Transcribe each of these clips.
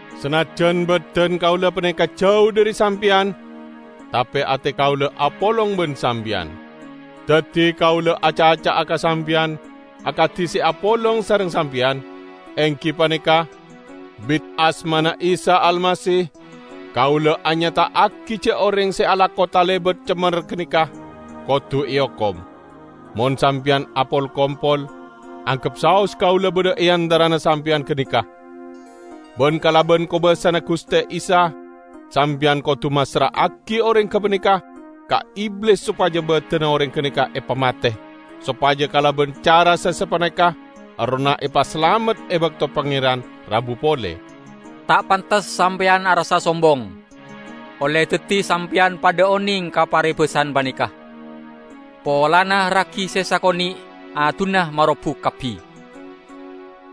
Sanajjan badan kaula paneka jau dhari sampeyan, tape ate kaula apolong ban sampeyan. Daddi kaula acaca'a ka sampeyan akadi se apolong sareng sampeyan, enggi paneka, "Bit asmana Isa Almasih, kaula anyata'agi ja' oreng se alako talebat cemmer ganeka, kodu eokom." Mon sampeyan apol-kompol, anggep saos kaula badha e antarana sampeyan ganeka, ban kalaban kobasana Guste Isa, sampeyan kodu massra'agi oreng gapaneka ka Iblis sopaja badanna oreng ganeka epamate, sopaja kalaban cara se sapaneka errohna epasalamet e bakto Pangeran rabu pole. Ta' pantes sampeyan arassa sombong. Olle daddi sampeyan padha oneng ka parebasan paneka, "Polana ragi se sakone' adunna marobuk kabbi!"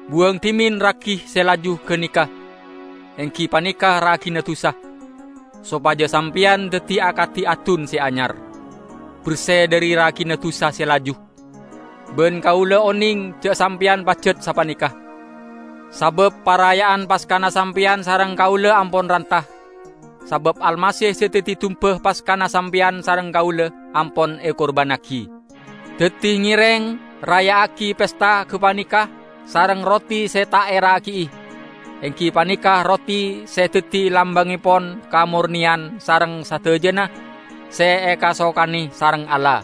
Buwang dhimen ragi se laju ganeka, enggi paneka ragina dusa, sopaja sampeyan daddi akadi adun se anyar, berse dhari ragina dusa se laju, ban kaula oneng ja' sampeyan pajat sapaneka. Sabab paraya'an Paskana sampeyan sareng kaula ampon ranta, sabab Almasih se daddi dumba Paskana sampeyan sareng kaula, ampon ekurbannagi. Daddi ngereng raya'agi pesta gapaneka sareng roti se ta' eragi'i, enggi paneka roti se daddi lambangngepon kamorneyan sareng sadajana se ekasokane sareng Allah.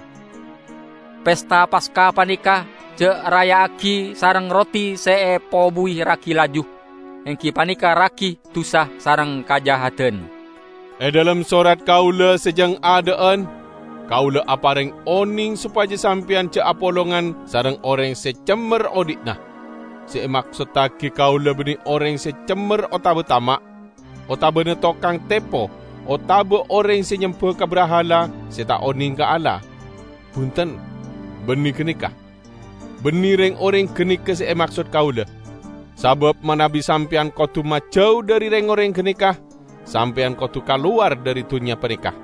Pesta Paska paneka ja' raya'agi sareng roti se epobuwi ragi laju, enggi paneka ragi dusa sareng kajahadan. E dhalem sorat kaula se jang adha'an, kaula apareng oneng sopaja sampeyan ja' apolongan sareng oreng se cemmer odhi'na. Se emaksottagi kaula banne oreng se cemmer otaba tama', otabana tokang tepo otaba oreng se nyemba ka brahala se ta' oneng ka Allah. Bunten, banne ganeka! Banne reng-oreng ganeka se emaksod kaula; sabab manabi sampeyan kodu majau dhari reng-oreng ganeka, sampeyan kodu kalowar dhari dunnya paneka.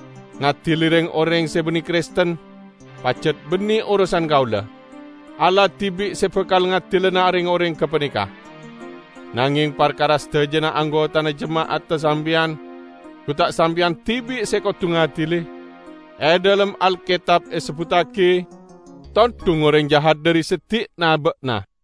Ngadili reng-oreng se banne Kristen pajat banne orosan kaula. Allah dibi' se bakal ngadilana reng-oreng gapaneka. Nangeng, parkara sadajana anggotana jema'adda sampeyan, gu ta' sampeyan dibi' se kodu ngadili? E dhalem Alketab esebbuttagi, "Tondhung oreng jahat dhari seddi'na ba'na."